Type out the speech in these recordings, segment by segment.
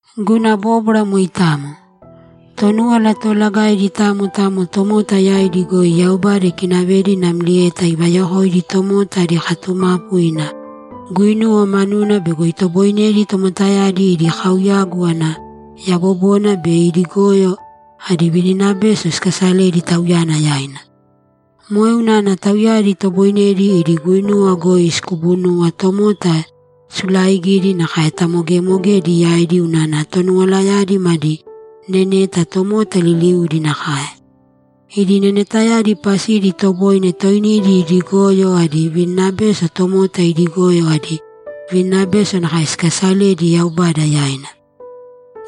Guna bóbwara moitamo. Tonúwala Toolagaidi tamo tamo tomota yaidi goi Yaubada ikinavedi namlieta ivayokoidi tomota adi katumapu ina guinuwa manuna bego itoboinedi tomotayadi idi kauyagu ana yabobona be idi goyo adi vininabeso sikasaledi Tauyana yaina. Moe unana tauyadi itoboinedi idi guinuwa goi sikubunuwa tomota sulaaigidi nakae tamogemogedi yaidi unana Tonuwalayadi madi neneta tomota liliudi nakae. Idi nenetayadi pasidi itoboine toinidi idi goyo adi vininabeso tomota idi goyo adi vininabeso nakae sikasaledi Yaubada yaina.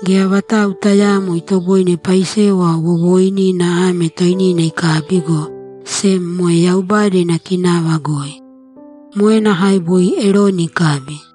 Geya vatau tayaamo itoboine paisewa wowooinina ame toinina ikabi, go sem moe Yaubada ina kinava goi. Moe nakae boi Eroni ikabi.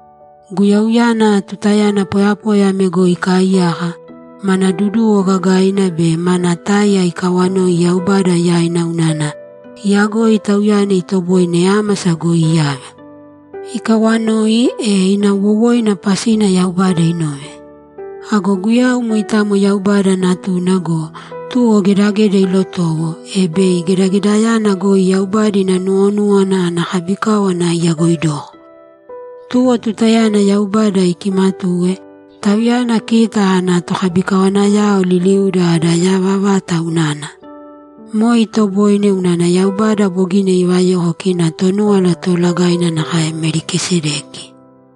Guyauyana, tutayana poyapoya ame goi ikaaiyaka, mana duduwo gagaina be mana táiya ikawanoi Yaubada yaina unana iyagoi Tauyana itoboine ámasa goi iyave. Ikawanoi, e ina wowoina pasina Yaubada inove. Ago Guyau moitamo Yaubada Natuna go, tuwo gedageda ilotowo, e bei gedagedayana goi Yaubada ina nuwonúwana ana kabikáwana iyagoidoko. Tuwo tutayana Yaubada ikimatuwe, Tauyana kita ana tokabikawanayao liliuda ada yava vata unana. Moe itoboine unana Yaubada bogina ivayoko kina Tonúwala Toolagaina nakae Melikisedeki.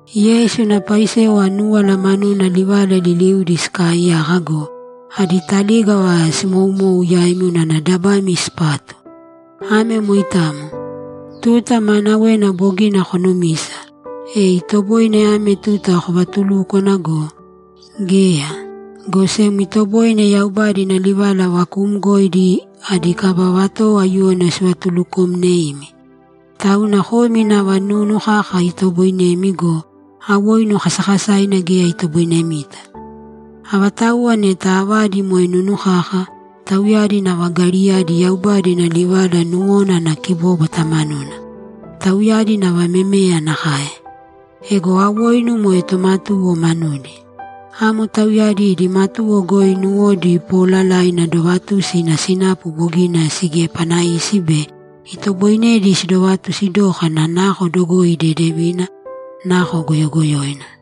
Yeisu ina paisewa núwala manuna livala liliudi sikaaiyaka go, adi talígava simoumou yaimi unana dabami sipatu. Ame moitamo. Tuta maanawena bogina konumisa, e itoboine ame tuta kovatulúkwana go, geya, go sem itoboine Yaubada ina livala vakuumgoidi adi kaba vatowo aiyuwoina sivatuluukomneimi. Tauna komi nava nunu kaka itoboinemi go, awoinu kasakasaina geya itoboinemita. Avatauwa neta avadi moe nunu kaka, tauyadi nava gariyadi Yaubada ina livala nuwona ana kibóbwata manuna. Tauyadi nava memeya nakae. Ego awoinu moe tomatuwo manudi. Amo tauyadi idi matuwo goi nuwodi poolalaina dovatusi ina sinapu bogina sigiepanaisi be itoboinedi sidovatusi dókana nako dogoi dedevina, nako goyogoyoina.